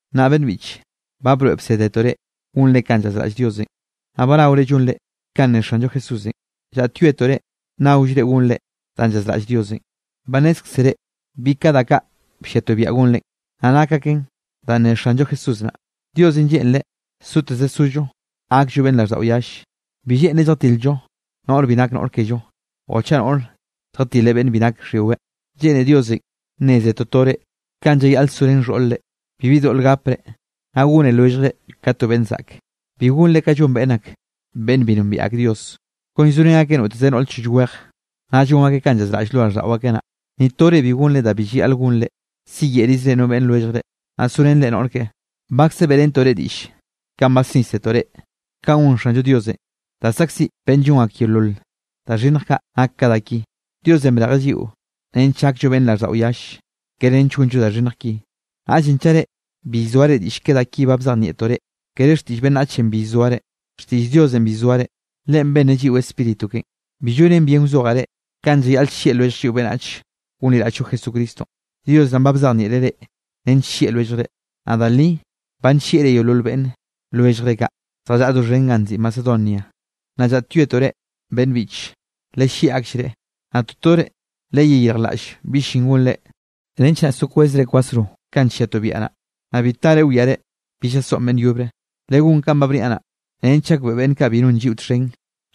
Nnaꞌ beꞌnn biꞌche, ba broeꞌ bsédetoꞌ reꞌ gonre kanꞌ llazraꞌll Diosenꞌ, naꞌ ba naore llonrenꞌ. Kanꞌ ne Xanllo Jesúsenꞌ, llaꞌtyoetoꞌ reꞌ, nnaollre gonre danꞌ llazraꞌll Diosenꞌ. Ba nnézkzere bi ka da kaꞌ blliatoꞌ biaꞌa gonrenꞌ, naꞌ nak aken danꞌ ne Xanllo Jesús naꞌ. Diosenꞌ lleꞌnreꞌ soteze sollo gakllo beꞌnn raꞌlldaꞌo yalle. Bi lleꞌnreꞌ lljatil-llo noꞌre bi nak noꞌr kello o chaꞌ noꞌre lljatileꞌ beꞌnne bi nake xhyiweꞌ. Lleꞌne Diosenꞌ nneze totore kanꞌ llayaꞌle sorén xhoꞌr-re, bibi doꞌl gapre, naꞌ gone lwelljre ka to beꞌnn zaꞌke. Bi gonre kanꞌ llon ak beꞌnne bi nombiaꞌ ak Dios, kon llzorén akeꞌ noteze noꞌre choll weje, naꞌ llon akeꞌ kanꞌ llzaꞌraꞌll lo raꞌlldaꞌo akeꞌ naꞌ. Ni to reꞌ bi gonre da bi llayaꞌl gonre, siyeꞌrizre no beꞌnn lwelljre, naꞌ sorenre noꞌr keꞌe. Bakze beꞌrentoꞌ reꞌ diꞌll kanꞌ basnísetoꞌ reꞌ, kanꞌ gon Xanllo Diosenꞌ da saꞌkziꞌ beꞌnn llon ak yeolol da xhinnj kaꞌ nak ka da ki. Diosenꞌ brejeꞌ lliꞌo nench gakllo beꞌnne raꞌlldaꞌo yalle, kere nench gonllo da xhinnj ki. Naꞌllenꞌ chaꞌ reꞌ bi llzoare diꞌll ke da ki ba bzejnieꞌtoꞌ reꞌ, kere xtiꞌll beꞌnnachenꞌ bi llzoare, xtiꞌll Diosenꞌ bi llzoare. Leꞌen benneꞌ lliꞌo Spíritu keꞌen. Bi llonen bien wzojaꞌ reꞌ, kanꞌ llayaꞌle llieꞌ lwellj lliꞌo beꞌnnach gonliraꞌll-llo Jesucristonꞌ. Dios naꞌn ba bzejnieꞌreꞌ reꞌ nench llieꞌ lwelljre. Naꞌ da li ba nllieꞌre yeolol beꞌnne lwelljre kaꞌ, zjallaꞌa doxhen ganꞌ nziꞌi Macedonia. Nnaꞌ llaꞌtyoetoꞌ reꞌ beꞌnn biꞌche, lellieꞌ akllreꞌ. Naꞌ totore leyeyirjlaꞌll bi llin gonre, nench naꞌ so kwezre kwasro kanꞌ nlliatoꞌ biaꞌa naꞌ, naꞌ bi tare wiare bi llasoꞌn beꞌnn yobre. Legón kanꞌ ba bniaꞌ naꞌ, nench gakbeꞌe beꞌnn kaꞌ bi non lliꞌo txhen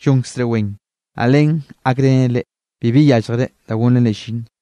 llonkzre wen, naꞌ len gakrenen reꞌ, bibi yálljere da gonrenre llin.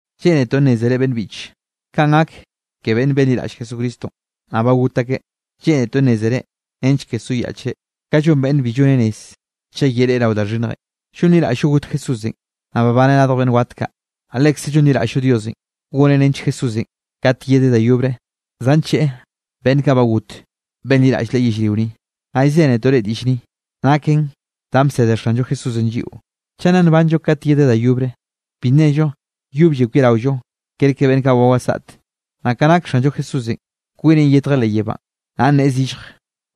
Lleꞌnetoꞌ nnézere beꞌnne biꞌche, kanꞌ gak ke beꞌnn benliraꞌll Jesucristonꞌ, naꞌ ba got akeꞌ. Lleꞌnetoꞌ nnézere nench ke soyaꞌchre, kanꞌ llon beꞌnne bi llone rez chaꞌ yereꞌe rao da xhinnjenꞌ. Llonliraꞌll-llo got Jesúsenꞌ, naꞌ babaneꞌ radj beꞌnn wat kaꞌ. Naꞌ lekze llonliraꞌll-llo Diosenꞌ goneꞌ nench Jesúsenꞌ, kat yedeꞌ da yobre, zancheꞌe beꞌnn kaꞌ ba got benliraꞌll Leꞌe yellrio ni. Naꞌ llzénetoꞌ reꞌ diꞌll ni, naken danꞌ bsede Xanllo Jesúsenꞌ lliꞌo. Chaꞌ nna nbanllo kat yedeꞌ da yobre, bi nnello yoblle kwiaraollo kerke beꞌnn kaꞌ ba wasaꞌte. Naꞌ ka nake Xanllo Jesúsenꞌ kwineꞌn yetjeꞌ leꞌ yebánꞌ, naꞌ nneꞌe zillje,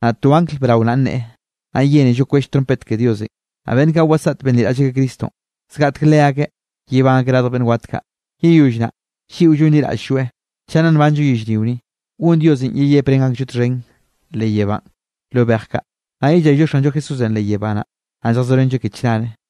naꞌ to angl brao naꞌ nneꞌe, naꞌ yénello kwell trompet ke Diosenꞌ. Naꞌ beꞌnn kaꞌ wasaꞌt benliraꞌll akeꞌ Cristonꞌ, zgaꞌtek leakeꞌ yebán akeꞌ radj beꞌnn wat kaꞌ. Yeyoll naꞌ, lliꞌo llonliraꞌll-lloeꞌ, chaꞌ nna nbanllo yellrio ni, gon Diosenꞌ yeyeprén aklloeꞌ txhen leꞌ yebánꞌ lo bej kaꞌ, naꞌ yellayllo Xanllo Jesúsenꞌ leꞌ yebá naꞌ. Naꞌ lljazorenlloeꞌ ke chnare.